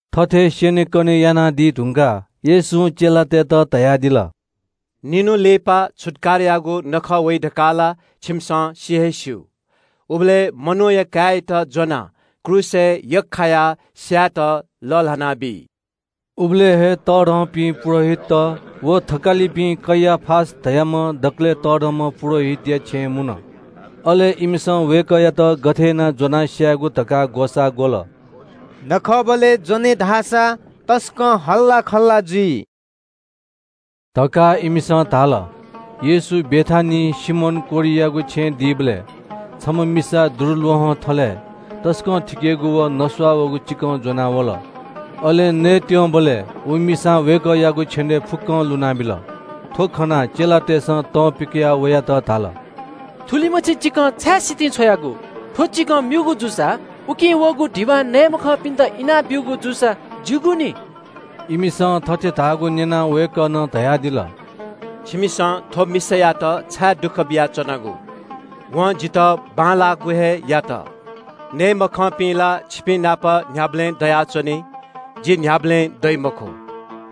थथे स्‍यनेकने यानादी धुंकाः येशूं चेलातय्‌त धयादिल – “निन्‍हु लिपा छुत्‍काराया नखः वइ धकाः ला छिमिसं सि हे स्‍यू। उबलय् मनूया काय्‌यात ज्‍वनाः क्रूसय् यख्‍खायाः स्‍यायेत लःल्‍हानाबी।” उबलय् हे तःधंपिं पुजाहारीत व थकालिपिं कैयाफा धाःम्‍ह दकलय् तःधंम्‍ह पुजाहारीया छेँय् मुन। अले इमिसं वय्‌कःयात गथे यानाः ज्‍वनाः स्‍यायेगु धकाः ग्‍वसाः ग्‍वल। “नखःबलय् ज्‍वने धाःसा तसकं हल्‍लाखल्‍ला जुइ” धकाः इमिसं धाल। येशू बेथानियाय् सिमोन कोह्रियागु छेँय् दीबलय् छम्‍ह मिसा दुरूल्‍वहं थलय् तसकं थिकेगु व नस्‍वाःगु चिकं ज्‍वनाः वल। अले नयेत्‍यंबलय् व मिसां वय्‌कःयागु छेनय् फुक्‍कं लुनाबिल। थ्‍व खनाः चेलातय्‌सं तं पिकयाः वयात धाल – “थुलिमछि चिकं छाय् सितिं छ्वयागु? थ्‍व चिकं म्‍यूगु जूसा उकिं वःगु धिबा नये मखंपिन्‍त इनाब्‍यूगु जूसा ज्‍यूगु नि।” इमिसं थथे धाःगु न्‍यनाः वय्‌कलं धयादिल – “छिमिसं थ्‍व मिसायात छाय् दुःख बियाच्‍वनागु? वं जितः बांलाःगु हे यात। नये मखंपिं ला छिपिंनाप न्‍ह्याबलें दयाच्‍वनी। जि न्‍ह्याबलें दइ मखु।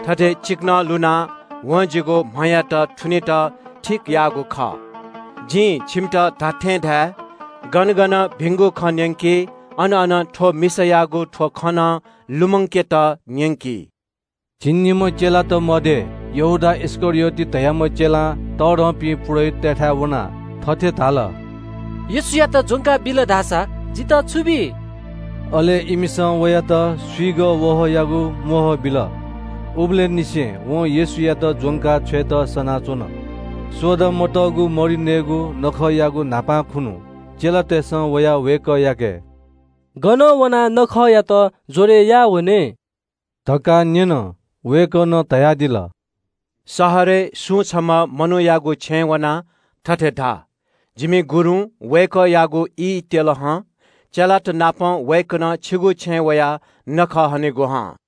थथे चिकनं लुनाः वं जिगु म्‍हयात थुनेत ठीक याःगु खः। जिं छिमित खःगु खँ धाये – गन गन भिंगु खँ न्‍यंकी, अन अन थ्‍व मिसां याःगु थ्‍व खँ नं लुमंकेत न्‍यंकी।” झिंनिम्‍ह चेलात मध्‍ये यहूदा इस्‍करियोत धाःम्‍ह चेलां तःधंपिं पुजाहारीतय्‌थाय् वनाः थथे धाल – “येशूयात ज्‍वंका बिल धाःसा जितः छु बी?” अले इमिसं वयात स्‍विगः वहःयागु म्‍वहः बिल। उबलय् निसें वं येशूयात ज्‍वंका छ्वयेत सनाच्‍वन। सोडा मतःगु मरि नयेगु नखःयागु न्‍हापां खुन्‍हु चेलातय्‌सं वयाः वय्‌कःयाके – “गन वनाः छुत्‍काराया नखःयात ज्‍वरय् याः वने?” धकाः न्‍यन। वय्‌कलं धयादिल – “शहरय् सुं छम्‍ह मनूयागु छेँय् वनाः थथे धा – ‘जिमि गुरुं वय्‌कःयागु ई त्‍यल हं। चेलातनापं वय्‌कलं छिगु छेँय् वयाः छुत्‍काराया नखः हनेगु हं।’”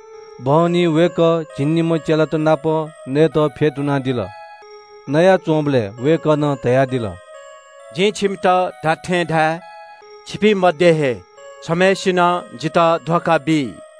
बहनी वय्‌कः झिंनिम्‍ह चेलात नाप नयेत फ्‍यतुनादिल। नयाच्‍वंबलय् वय्‌कलं धयादिल – “जिं छिमित खःगु खँ धाये – छिपिं मध्‍ये हे छम्‍हय्‌सिनं जितः धोखा बी।”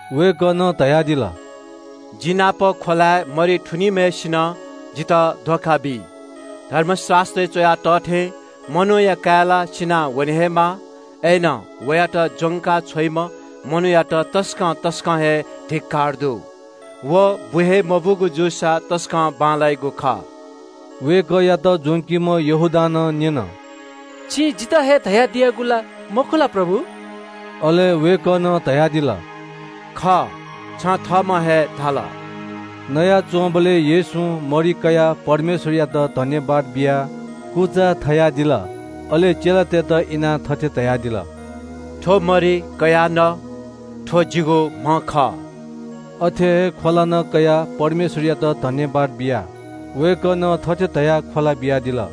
वय्‌कलं धयादिल – “जि नाप ख्‍वलाय् मरि थुनीम्‍हय्‌सिनं जितः धोखा बी। धर्मशास्‍त्रय् च्‍वया तः थें मनूया काय् ला सिनावने हे माः। अय्‌नं वयात ज्‍वंका छ्वइम्‍ह मनूयात तसकं तसकं हे धिक्‍कार दु। व बु हे मबूगु जूसा तसकं बांलाइगु खः।” वय्‌कःयात ज्‍वंकीम्‍ह यहूदां नं न्‍यन – “छिं जितः हे धयादियागु ला मखु ला प्रभु?” अले वय्‌कलं धयादिल – “खः, छं थःम्‍हं हे धाल।” नयाच्‍वंबलय् येशूं मरि कयाः परमेश्‍वरयात सुभाय् बियाः कुचा कुचा थलादिल। अले चेलातय्‌त इनाः थथे धयादिल – “थ्‍व मरि कयाः न। थ्‍व जिगु म्‍ह खः।” अथे हे ख्‍वला नं कयाः परमेश्‍वरयात सुभाय् बियाः वय्‌कलं थथे धयाः ख्‍वला बियादिल –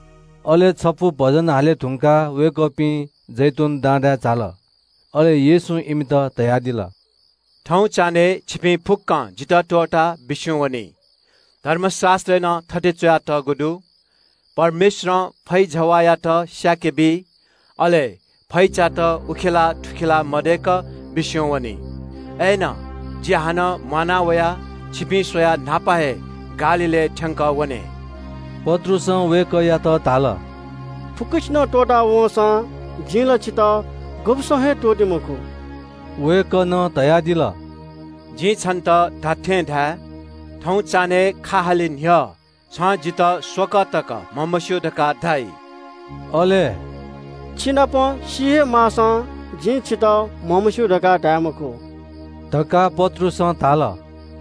अले छपु भजन हाले धुंकाः वय्‌कःपिं जैतून डाँडाय् झाल। अले येशूं इमित धयादिल – “थौं चान्‍हय् छिपिं फुक्‍कं जितः त्‍वःताः बिस्‍युं वनी। धर्मशास्‍त्रय् नं थथे च्‍वयातःगु दु – “‘जिं फैजवाःयात स्‍यानाबी, अले फैचात उखेलाः थुखेलाः जुइ।’ “अय्‌नं जि हानं म्‍वाना वयाः छिपिं स्‍वयाः न्‍हापा हे गालीलय् थ्‍यंकः वने।” पत्रुसं वय्‌कःयात धाल – “फुक्‍कसिनं त्‍वःता वंसां जिं ला छितः गुब्‍सं हे त्‍वःते मखु।” वय्‌कलं धयादिल – “जिं छन्‍त खःगु खँ धाये – थौं चान्‍हय् खा हाले न्‍ह्यः छं जितः स्‍वकः तक म्‍हमस्‍यू धकाः धाइ।” अय्‌नं “छिनाप सी हे माःसां जिं छितः म्‍हमस्‍यू धकाः धाये मखु” धकाः पत्रुसं धाल।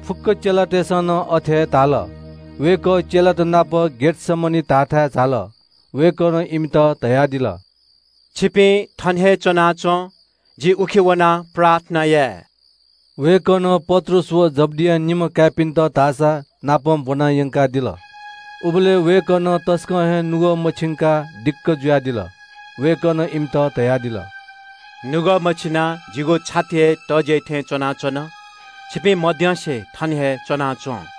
फुक्‍क चेलातय्‌सं नं अथे हे धाल। वय्‌कः चेलात नाप गेतसमनी धाःथाय् झाल। वय्‌कलं इमित धयादिल – “छिपिं थन हे च्‍वनाच्‍वँ। जि उखे वनाः प्रार्थना याये।” वय्‌कलं पत्रुस व जब्‍दिया निम्‍ह काय्‌पिन्‍त धाःसानापं ब्‍वना यंकादिल। उबलय् वय्‌कलं तसकं हे नुगः मछिंकाः दिक्‍क जुयादिल। वय्‌कलं इमित धयादिल – “नुगः मछिनाः जिगु छाति हे तज्‍याइ थें च्‍वनाच्‍वन। छिपिं मद्यंसे थन हे च्‍वनाच्‍वँ।”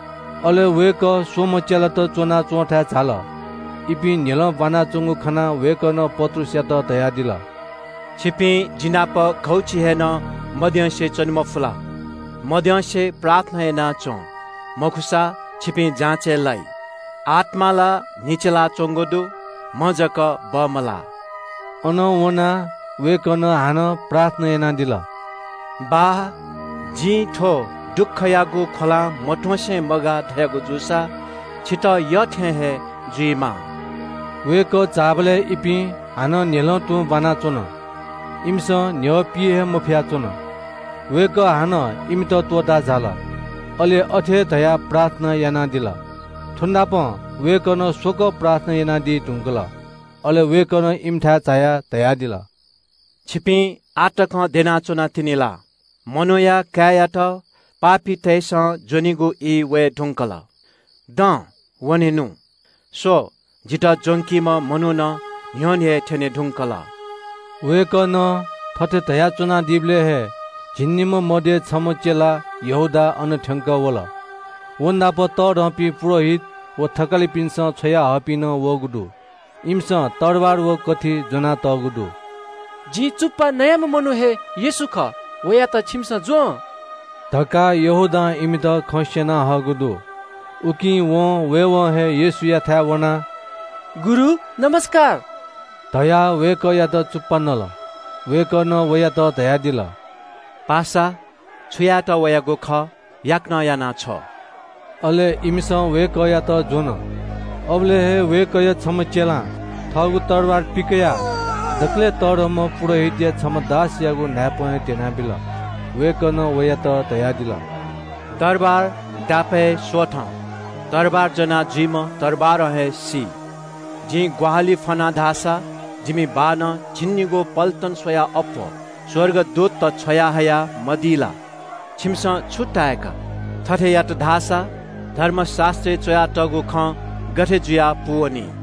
अले वय्‌कः स्‍वम्‍ह चेलात च्‍वनाच्‍वंथाय् झाल। इपिं न्‍ह्यलं ब्‍वानाच्‍वंगु खनाः वय्‌कलं पत्रुसयात धयादिल – “छिपिं जि नाप घौछि हे नं मद्यंसे च्‍वने मफु ला? मद्यंसे प्रार्थना याना च्‍वँ, मखुसा छिपिं जाँचय् लाइ। आत्‍मा ला न्‍ह्यचिलाच्‍वंगु दु, म्‍ह जक बमलाः।” अनं वनाः वय्‌कलं हानं प्रार्थना यानादिल – “बाः, जिं थ्‍व दुःखयागु ख्‍वलां मत्‍वंसे मगाः धयागु जूसा, छितः यःथें हे जुइमा।” वय्‌कः झाःबलय् इपिं हानं न्‍ह्यलं तुं ब्‍वानाच्‍वन। इमिसं न्‍ह्यः पी हे मफया च्‍वन। वय्‌कः हानं इमित त्‍वःताः झाल। अले अथे हे धयाः प्रार्थना यानादिल। थ्‍वनापं वय्‌कलं स्‍वकः प्रार्थना यानादी धुंकल। अले वय्‌कलं इमिथाय् झायाः धयादिल – “छिपिं आः तक द्यना च्‍वनातिनि ला? मनूया काय्‌यात पापीतय्‌सं ज्‍वनीगु ई वये धुंकल। दँ, वनेनु। स्‍व, जितः ज्‍वंकीम्‍ह मनू नं न्‍ह्यःने थ्‍यने धुंकल।” वय्‌कलं थथे धयाच्‍वनादीबलय् हे झिंनिम्‍ह मध्‍ये छम्‍ह चेला यहूदा अन थ्‍यंकः वल। व नाप तःधंपिं पुजाहारीत व थकालिपिन्‍सं छ्वयाहःपिं नं वःगु दु। इमिसं तरवार व कथि ज्‍वनातःगु दु। “जिं वनाः चुप्‍पा नइम्‍ह मनू व हे खः, छिमिसं वयात ज्‍वँ” धकाः धोखा बीम्‍हय्‌सिनं इमित खँ स्‍यना हःगु दु। उकिं वं वयेवं हे येशूयाथाय् वनाः “गुरु, ज्‍वजलपा” धयाः वय्‌कःयात चुप्‍पा नल। वय्‌कलं वयात धयादिल – “पासा, छु यायेत वयागु खः याकनं याना छ्व।” अले इमिसं वय्‌कःयात ज्‍वन। अबलय् हे वय्‌कःया छम्‍ह चेलां थःगु तरवार पिकयाः दकलय् तःधंम्‍ह पुजाहारीया छम्‍ह दासयागु न्‍हाय्‌पं हे ध्‍यनाबिल। वय्‌कलं वयात धयादिल – “तरवार दापय् स्‍वथँ। तरवार ज्‍वनाजुइम्‍ह तरवारं हे सी। जिं ग्‍वाहालि फ्‍वन धाःसा जिमि बाःनं झिंनिगू पल्‍टन स्‍वयाः अप्‍वः स्‍वर्गदूतत छ्वयाहया मदी ला? छिमिसं छु ताय्‌का? थथे यात धाःसा धर्मशास्‍त्रय् च्‍वयातःगु खँ गथे जुयाः पूवनी?”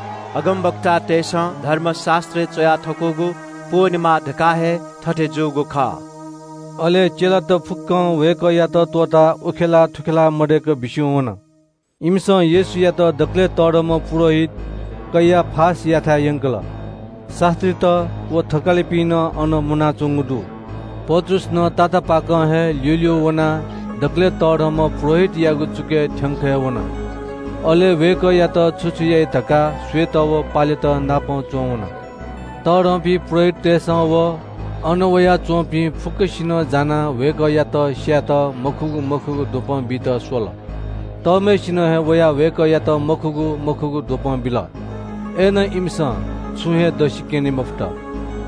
अगमवक्तातय्‌सं धर्मशास्‍त्रय् च्‍वया थकूगु पूवनेमा धकाः हे थथे जूगु खः।” अले चेलात फुक्‍कं वय्‌कःयात त्‍वःताः उखेलाः थुखेलाः मदय्‌क बिस्‍युं वन। इमिसं येशूयात दकलय् तःधंम्‍ह पुजाहारीत कैयाफायाथाय् यंकल। शास्‍त्रीत व थकालिपिं नं अन मुनाच्‍वंगु दु। पत्रुस नं तातापाकं हे ल्‍यूल्‍यू वनाः दकलय् तःधंम्‍ह पुजाहारीया चुकय् थ्‍यंक हे वन। अले वय्‌कःयात छु छु याइ धकाः स्‍वयेत व पालेत नाप च्‍वंवन। तःधंपिं पुजाहारीतय्‌सं व अन वयाच्‍वंपिं फुक्‍कसिनं जानाः वय्‌कःयात स्‍यायेत मखुगु मखुगु द्वपं बीत स्‍वल। तःम्‍हय्‌सिनं हे वयाः वय्‌कःयात मखुगु मखुगु द्वपं बिल। अय्‌नं इमिसं छुं हे दसि क्‍यने मफुत।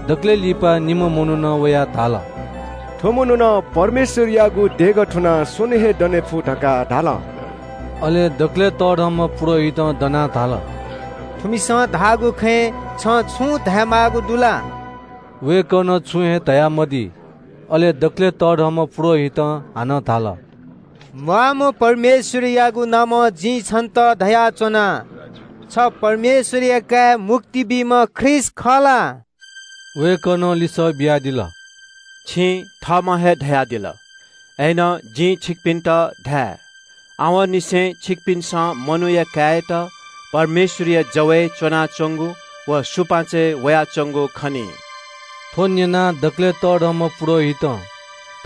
दकलय् लिपा निम्‍ह मनुखं वयाः धाल – “थ्‍व मनुखं ‘परमेश्‍वरयागु देगः थुनाः स्‍वन्‍हुं हे दने फु’ धकाः धाल।” अले दकलय् तःधंम्‍ह पुजाहारीं दनाः धाल – “थुमिसं धाःगु खँय् छं छुं धायेमाःगु दु ला?” वय्‌कलं छुं हे धयामदी। अले दकलय् तःधंम्‍ह पुजाहारीं हानं धाल – “म्‍वाःम्‍ह परमेश्‍वरयागु नामं जिं छन्‍त धयाच्‍वना – छ परमेश्‍वरया काय्, मुक्ति बीम्‍ह ख्रीष्‍ट खः ला?” वय्‌कलं लिसः बियादिल – “छिं थःम्‍हं हे धयादिल। अय्‌नं जिं छिकपिन्‍त धाये – आवंनिसें छिकपिन्‍सं मनूया काय्‌यात परमेश्‍वरया जव ल्‍हाःपाखे च्‍वनाच्‍वंगु व सुपाँचय् वयाच्‍वंगु खनी।” थ्‍व न्‍यनाः दकलय् तःधंम्‍ह पुजाहारीं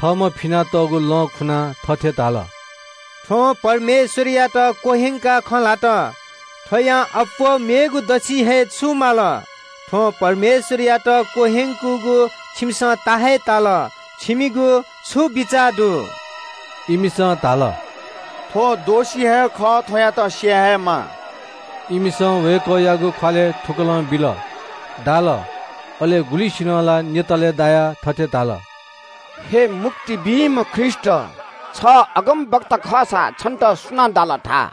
थःम्‍हं फिनातःगु लं खुनाः थथे धाल – “थ्‍वं परमेश्‍वरयात क्‍वह्यंकाः खँ ल्‍हात। थ्‍वयां अप्‍वः मेगु दसि हे छु माल? थ्‍वं परमेश्‍वरयात क्‍वह्यंकूगु छिमिसं ता हे ताल। छिमिगु छु बिचाः दु?” इमिसं धाल – “थ्‍व दोषी हे खः, थ्‍वयात स्‍याये हे माः।” इमिसं वय्‌कःयागु ख्‍वालय् थुकलं बिल, दाल। अले गुलिसिनं ला न्‍यतालय् दायाः थथे धाल – “हे मुक्ति बीम्‍ह ख्रीष्‍ट, छ अगमवक्ता खःसा छन्‍त सुनां दाल, धा।”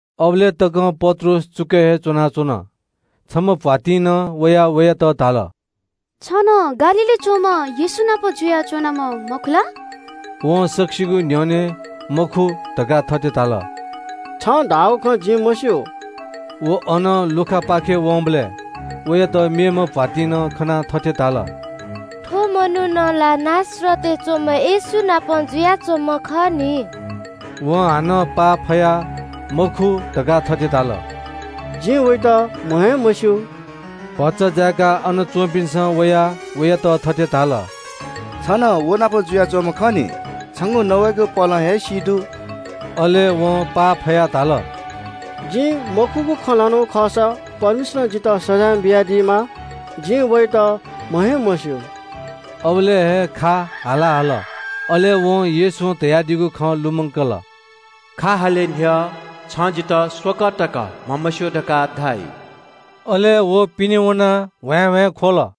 अबलय् तकं पत्रुस चुकय् हे च्‍वनाच्‍वन। छम्‍ह भ्‍वातिं नं वयाः वयात धाल – “छ नं गालीलय् च्‍वंम्‍ह येशूनापं जुयाच्‍वंम्‍ह मखु ला?” वं सकसिगुं न्‍ह्यःने “मखु” धकाः थथे धाल – “छं धाःगु खँ जिं मस्‍यू।” व अनं लुखापाखे वंबलय् वयात मेम्‍ह भ्‍वातिं नं खनाः थथे धाल – “थ्‍व मनू ला नासरतय् च्‍वंम्‍ह येशू नाप जुयाच्‍वंम्‍ह खः नि।” वं हानं पाफयाः “मखु” धकाः थथे धाल – “जिं वयात म्‍ह हे मस्‍यू।” भचा जाय्‌काः अन च्‍वंपिन्‍सं वयाः वयात थथे धाल – “छ नं व नाप जुयाच्‍वंम्‍ह खः नि। छंगु नवाइगु पहलं हे सी दु।” अले वं पाफयाः धाल – “जिं मखुगु खँ ल्‍हानागु खःसा परमेश्‍वरं जितः सजाँय बियादीमा। जिं वयात म्‍ह हे मस्‍यू।” अबलय् हे ग्‍वंगः हाला हल। अले वं येशूं धयादीगु खँ लुमंकल – “खा हाले न्‍ह्यः छं जितः स्‍वकः तक म्‍हमस्‍यू धकाः धाइ।” अले व पिने वनाः ह्वाँय्‌ह्वाँय् ख्‍वल।